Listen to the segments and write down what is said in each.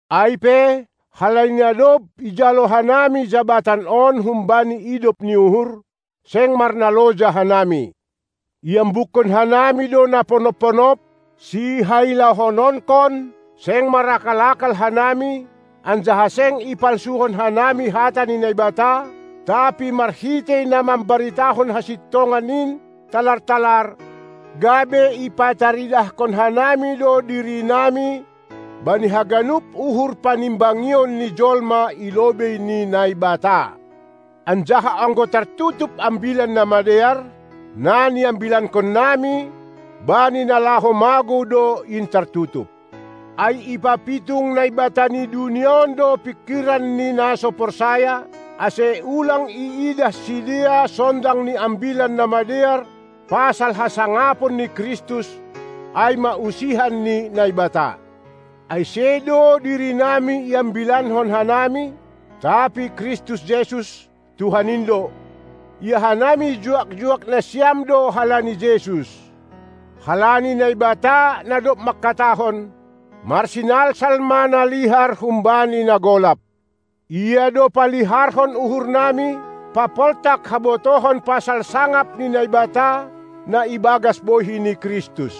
Ai pe, halani na dob ijalo hanami jabatan on humbani idop ni uhur, seng marnaloja hanami. Iambukkon hanami do na ponop-ponop, sihailahononkon; seng marakal-akal hanami, anjaha seng i palsuhon hanami hata ni Naibata, tapi marhitei na mambaritahon hasintongan in talar-talar, gabe ipataridahkon hanami do dirinami bani haganup uhur panimbangion ni jolma i lobei ni Naibata. Anjaha anggo tartutup Ambilan Namadear, na niambilankonnami, bani na laho magou do in tartutup. Ai ipapitung naibata ni dunia on do pingkiran ni na so porsaya, ase ulang iidah sidea sondang ni Ambilan Namadear pasal hasangapon ni Kristus, ai ma usihan ni Naibata. Ai sedo dirinami iambilankon hanami, tapi Kristus Jesus, Tuhan in do; ia hanami juak-juak nasiam do halani Jesus. Halani Naibata, na dob mangkatahon; "Marsinalsal ma na lihar humbani na golap," Ia do paliharhon uhurnami, papoltak habotohon pasal sangap ni Naibata, na ibagas bohi ni Kristus.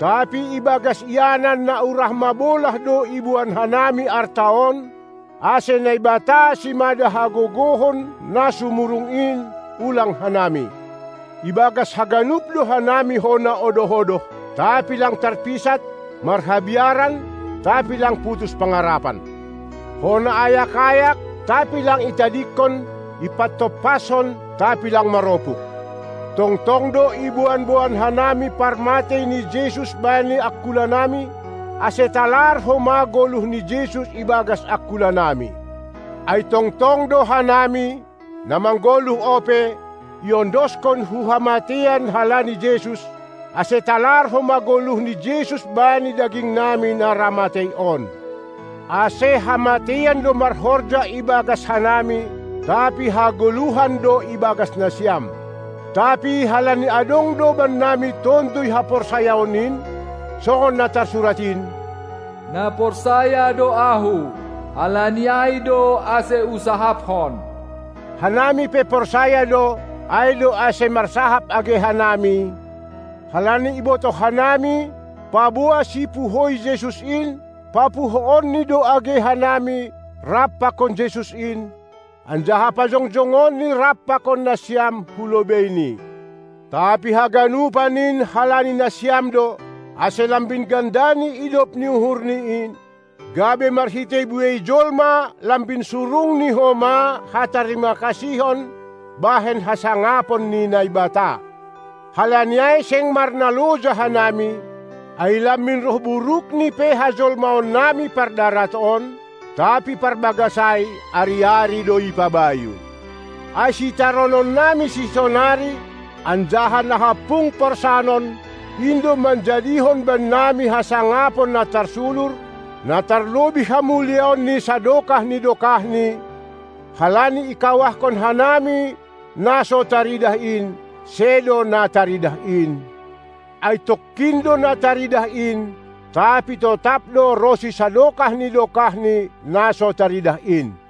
Tapi ibagas ianan na urah mabolah do iboan hanami arta on, ase Naibata simada hagogohon na sumurung in, ulang hanami. Ibagas haganup do hanami hona odoh-odoh, tapi lang tarpisat; marhabiaran, tapi lang putus pangarapan. Hona ayak-ayak, tapi lang itadingkon; ipatompaskon, tapi lang maropuk. Tongtong do iboan-boan hanami parmatei ni Jesus bani angkulanami, ase talar homa goluh ni Jesus ibagas angkulanami. Ai tongtong do hanami, na manggoluh ope, iondoskon hu hamateian halani Jesus, ase talar homa goluh ni Jesus bani dagingnami na ra matei on. Ase hamateian do marhorja ibagas hanami, tapi hagoluhan do ibagas nasiam. Tapi halani adong do bannami Tonduy haporsayaon in, songon na tarsurat in: "Na porsaya do ahu, halani ai do ase husahaphon," hanami pe porsaya do, ai do ase marsahap age hanami, halani ibotoh hanami, paboa Sipuhoi Jesus in, papuhoonni do age hanami rap pakon Jesus in, anjaha pajongjongonni rap pakon nasiam hulobeiNi. Tapi haganupan in halani nasiam do, ase lambin gandani idop ni uhur in, gabe marhitei buei jolma lambin surungni homa hatarimakasihon bahen hasangapon ni Naibata. Halani ai seng marnaloja hanami, ai lambin roh burukni pe hajolmaonnami pardarat on, tapi parbagas ai, ari-ari do ipabayu. Ai sitaronnami sisonari anjaha na hampung porsanon, in do manjadihon bannami hasangapon na tarsulur, na tarlobih hamuliaonNi sadokah ni dokahni, halani ikawahkon hanami na so taridah in, sedo na taridah in; ai tongkin do na taridah in, tapi totap do ronsi sadokah ni dokahni na so taridah in.